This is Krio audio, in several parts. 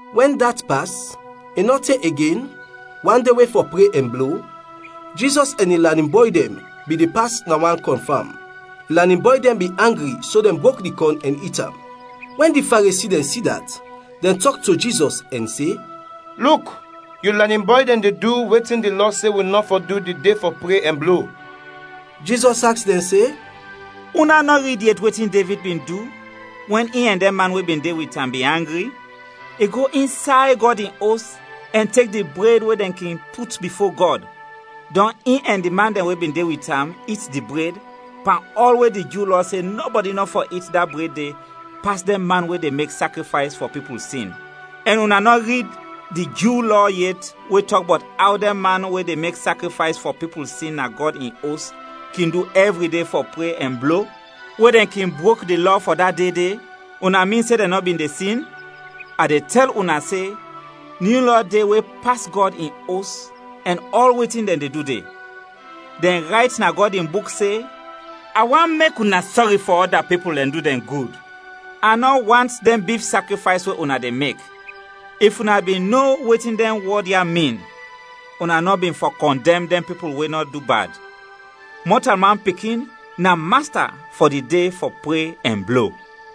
Wɛn dat pas, i nɔ te igen, wan de we fɔ pre ɛn blo, Jizɔs ɛn in lanin bɔy dɛn bin de pas na wan kɔn fam. In lanin bɔy dɛn bin angri so dɛn brok di kɔn ɛn it am. Wɛn di Faresi dɛn si dat, dɛn tɔk to Jizɔs ɛn se, “Luk, yu lanin bɔy dɛn de du wetin di Lɔ se wi nɔ fɔ du di de fɔ pre ɛn blo.” Jizɔs aks dɛn se, “Una nɔ rid yet wetin Devid bin du, wɛn in ɛn dɛn man we bin de wit am bin angri? I go insay Gɔd in Os ɛn tek di bred we dɛn kin put bifo Gɔd, dɔn i ɛn di man dɛn we bin de wit am it di bred, pan ɔl we di Ju Lɔ se nɔbɔdi nɔ fɔ it da bred de pas dɛn man we de mek sakrifays fɔ pipul sin. Ɛn una nɔ rid di Ju Lɔ yet we tɔk bɔt aw dɛn man we de mek sakrifays fɔ pipul sin na Gɔd in Os, kin du ɛvri de fɔ pre ɛn blo, we dɛn kin brok di lɔ fɔ da de de; una min se dɛn nɔ bin de sin? A de tɛl una se, nyu lɔ de we pas Gɔd in Os ɛn ɔl wetin dɛn de du de. Dɛn rayt na Gɔd in Buk se, ‘A want mek una sɔri fɔ ɔda pipul ɛn du dɛn gud, a nɔ want dɛn bif sakrifays we una de mek!’ If una bin no wetin dɛn wɔd ya min, una nɔ bin fɔ kɔndɛm dɛn pipul we nɔ du bad. Mɔtalman Pikin na Masta fɔ di de fɔ pre ɛn blo.”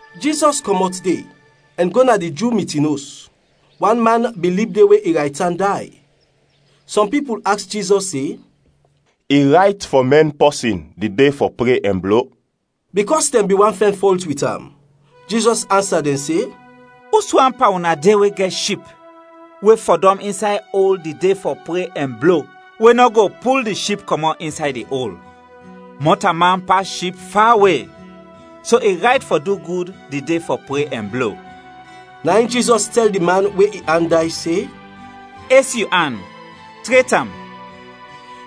Jizɔs kɔmɔt de, ɛn go na di Ju mitin os. Wan man bin lib de we in raytan day. Sɔm pipul aks Jizɔs se, “I rayt fɔ mɛn pɔsin di de fɔ pre ɛn blo?” bikɔs dɛn bin want fɛn fɔlt wit am. Jizɔs ansa dɛn se, “Us wan pan una de we gɛt ship, we fɔdɔm insay ol di de fɔ pre ɛn blo, we nɔ go pul di ship kɔmɔt insay di ol? Mɔtalman pas ship fawe! So i rayt fɔ du gud di de fɔ pre ɛn blo.” Na in Jizɔs tɛl di man we in an day se, “Es yu an, tret am.”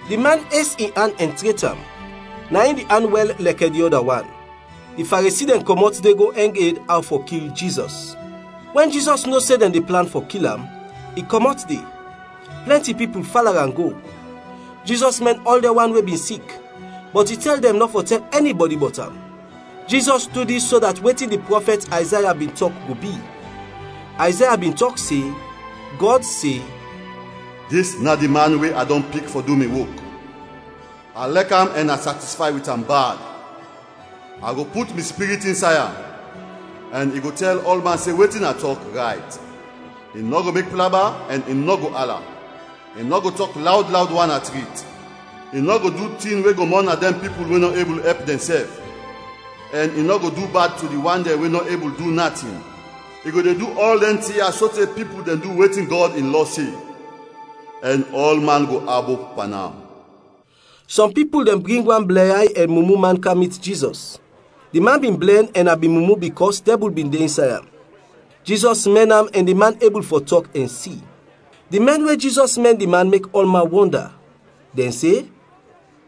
Di man es in an ɛn tret am, na in di an wɛl lɛkɛ di ɔda wan. Di Faresi dɛn kɔmɔt de go ɛng ed aw fɔ kil Jizɔs. Wɛn Jizɔs no se dɛn de plan fɔ kil am, i kɔmɔt de; plɛnti pipul fala am go. Jizɔs mɛn ɔl dɛn wan we bin sik, bɔt i tɛl dɛn nɔ fɔ tɛl ɛnibɔdi bɔt am. Jizɔs du dis so dat wetin di prɔfɛt Ayzaya bin tɔk go bi, Ayzaya bin tɔk se, Gɔd se, “Dis na di man we a dɔn pik fɔ du mi wok. A lɛk am ɛn a satisfay wit am bad. A go put mi Spirit insay am; ɛn i go tɛl ɔlman se wetin a tɔk, rayt. I nɔ go mek plaba, ɛn i nɔ go ala, i nɔ go tɔk lawd lawd wan na trit. I nɔ go du tin we go mɔna dɛn pipul we nɔ ebul ɛp dɛnsɛf, ɛn i nɔ go du bad to di wan dɛn we nɔ ebul du natin. I go de du ɔl dɛn tin ya sote pipul dɛn du wetin Gɔd in Lɔ se; ɛn ɔlman go abop pan am.” Sɔm pipul dɛn bring wan blɛnyay ɛn mumu man kam mit Jizɔs. Di man bin blɛn ɛn na bin mumu bikɔs dɛbul bin de insay am. Jizɔs mɛn am ɛn di man ebul fɔ tɔk ɛn si. Di mɛn we Jizɔs mɛn di man mek ɔlman wɔnda. Dɛn se,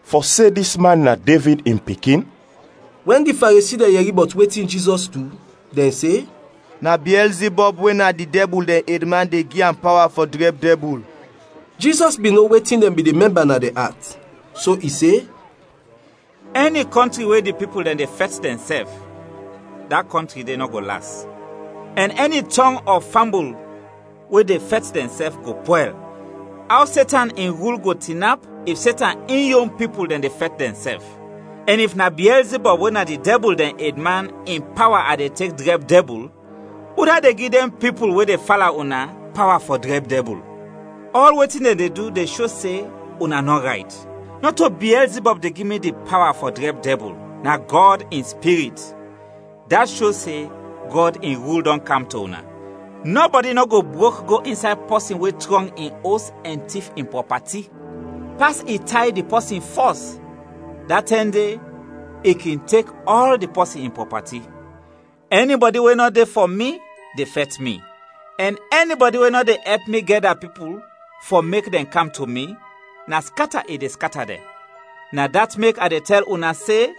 “Fɔ se dis man na Devid in pikin?” Wɛn di Faresi dɛn yɛri bɔt wetin Jizɔs du, dɛn se, “Na Biɛlzibɔb we na di dɛbul dɛn edman de gi am pawa fɔ drɛb dɛbul.” Jizɔs bin no wetin dɛn bin de mɛmba na dɛn at, so i se, “Ɛni kɔntri we di pipul dɛn de fɛt dɛnsɛf, da kɔntri de nɔ go las. Ɛn ɛni tɔng ɔ fambul we de fɛt dɛnsɛf, go pwɛl. Aw Setan in rul go tinap, if Setan in yon pipul dɛn de fɛt dɛnsɛf? Ɛn if na Biɛlzibɔb we na di dɛbul dɛn edman in pawa a de tek drɛb dɛbul; udat de gi dɛn pipul we de fala una, pawa fɔ drɛb dɛbul? Ɔl wetin dɛn de du de sho se una nɔ rayt. Nɔto Biɛlzibɔb de gi mi di pawa fɔ drɛb dɛbul, na Gɔd in Spirit. Dat sho se Gɔd in rul dɔn kam to una. “Nɔbɔdi nɔ go brok go insay pɔsin we trɔng in os ɛn tif in prɔpati, pas i tay di pɔsin fɔs; da tɛm de i kin tek ɔl di pɔsin in prɔpati. “Ɛnibɔdi we nɔ de fɔ mi de fɛt mi, ɛn ɛnibɔdi we nɔ de ɛp mi gɛda pipul fɔ mek dɛn kam to mi, na skata i de skata dɛn. Na dat mek a de tɛl una se,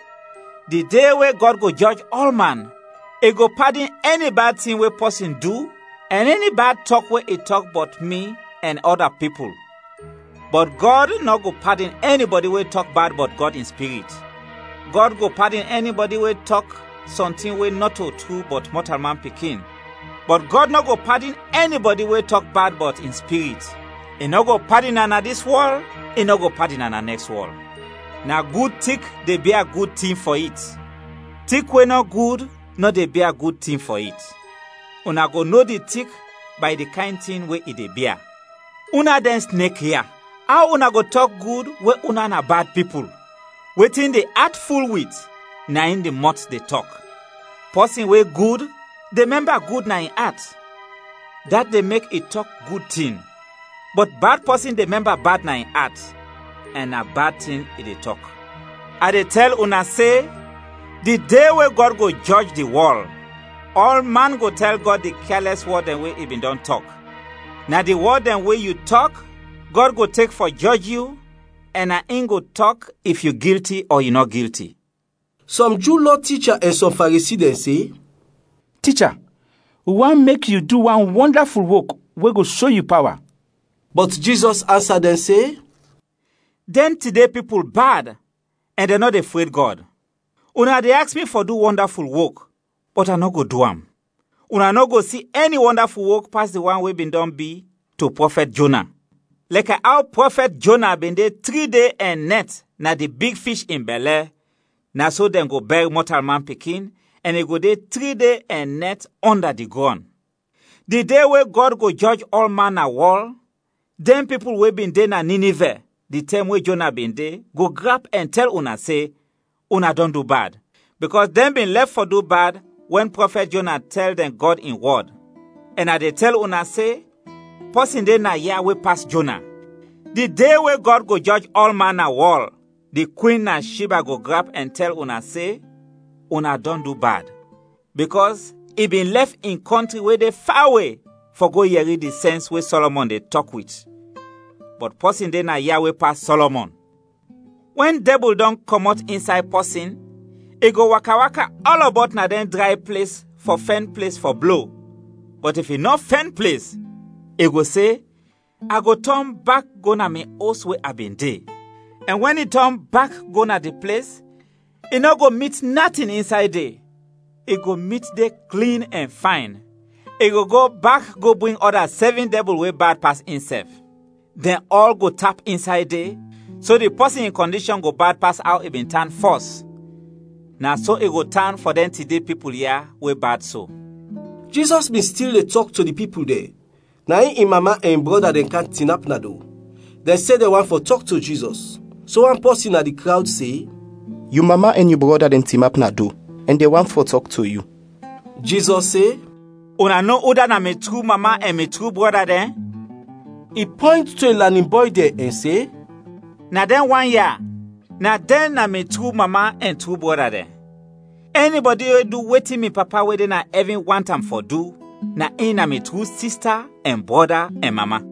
di de we Gɔd go jɔj ɔlman, i go padin ɛni bad tin we pɔsin du ɛn ɛni bad tɔk we i tɔk bɔt mi ɛn ɔda pipul; bɔt Gɔd nɔ go padin ɛnibɔdi we tɔk bad bɔt Gɔd in Spirit. Gɔd go padin ɛnibɔdi we tɔk sɔntin we nɔto tru bɔt Mɔtalman Pikin, bɔt Gɔd nɔ go padin ɛnibɔdi we tɔk bad bɔt in Spirit; i nɔ go padin am na dis wɔl, i nɔ go padin am na nɛks wɔl. “Na gud tik de bia gud tin fɔ it. Tik we nɔ gud nɔ de bia gud tin fɔ it. Una go no di tik bay di kayn tin we i de bia. Una dɛn snek ya! Aw una go tɔk gud we una na bad pipul? Wetin di at ful wit na in di mɔt de tɔk. Pɔsin we gud, de mɛmba gud na in at, dat de mek i tɔk gud tin; bɔt bad pɔsin de mɛmba bad na in at ɛn na bad tin i de tɔk. “A de tɛl una se, di de we Gɔd go jɔj di wɔl, ɔlman go tɛl Gɔd di kyalɛs wɔd dɛn we i bin dɔn tɔk. Na di wɔd dɛn we yu tɔk, Gɔd go tek fɔ jɔj yu ɛn na in go tɔk if yu gilti ɔ yu nɔ gilti.” Sɔm Ju Lɔ ticha ɛn sɔm Faresi dɛn se, “Ticha, wi want mek yu du wan wɔndaful wok we go sho yu pawa.” Bɔt Jizɔs ansa dɛn se, “Dɛn tide pipul bad ɛn dɛn nɔ de fred Gɔd. Una de aks mi fɔ du wɔndaful wok, bɔt a nɔ go du am. Una nɔ go si ɛni wɔndaful wok pas di wan we bin dɔn bi to prɔfɛt Jona. Lɛkɛ aw prɔfɛt Jona bin de tri de ɛn nɛt na di big fish in bɛlɛ, na so dɛn go bɛr Mɔtalman Pikin, ɛn i go de tri de ɛn nɛt ɔnda di grɔn. Di de we Gɔd go jɔj ɔlman na wɔl, dɛn pipul we bin de na Ninivɛ di tɛm we Jona bin de, go grap ɛn tɛl una se, una dɔn du bad; bikɔs dɛn bin lɛf fɔ du bad wɛn prɔfɛt Jona tɛl dɛn Gɔd in wɔd; ɛn a de tɛl una se, pɔsin de naya we pas Jona. Di de we Gɔd go jɔj ɔlman na wɔl, di kwin na Shiba go grap ɛn tɛl una se una dɔn du bad; bikɔs i bin lɛf in kɔntri we de fawe fɔ go yɛri di sɛns we Sɔlɔmɔn de tɔk wit. Bɔt pɔsin de naya we pas Sɔlɔmɔn! “Wɛn dɛbul dɔn kɔmɔt insay pɔsin, i go waka-waka ɔlɔbɔt na dɛn dray ples fɔ fɛn ples fɔ blo, bɔt if i nɔ fɛn ples, i go se, ‘A go tɔn bak go na mi os we a bin de.’ Ɛn wɛn i tɔn bak go na di ples, i nɔ go mit natin insay de, i go mit de klin ɛn fayn. I go go bak go bring ɔda sɛvin dɛbul we bad pas insɛf. Dɛn ɔl go tap insay de; so di pɔsin in kɔndishɔn go bad pas aw i bin tan fɔs. Na so i go tan fɔ dɛn tide pipul ya we bad so.” Jizɔs bin stil de tɔk to di pipul dɛn, na in in mama ɛn in brɔda dɛn kam tinap na do, dɛn se dɛn want fɔ tɔk to Jizɔs. So wan pɔsin na di krawd se, “Yu mama ɛn yu brɔda dɛn tinap na do, ɛn dɛn want fɔ tɔk to yu.” Jizɔs se, “Una no udat na mi tru mama ɛn mi tru brɔda dɛn?” I pɔynt to in lanin bɔy dɛn ɛn se, “Na dɛn wan ya, na dɛn na mi tru mama ɛn tru brɔda dɛn! Ɛnibɔdi we du wetin mi Papa we de na ɛvin want am fɔ du, na in na mi tru sista ɛn brɔda ɛn mama!”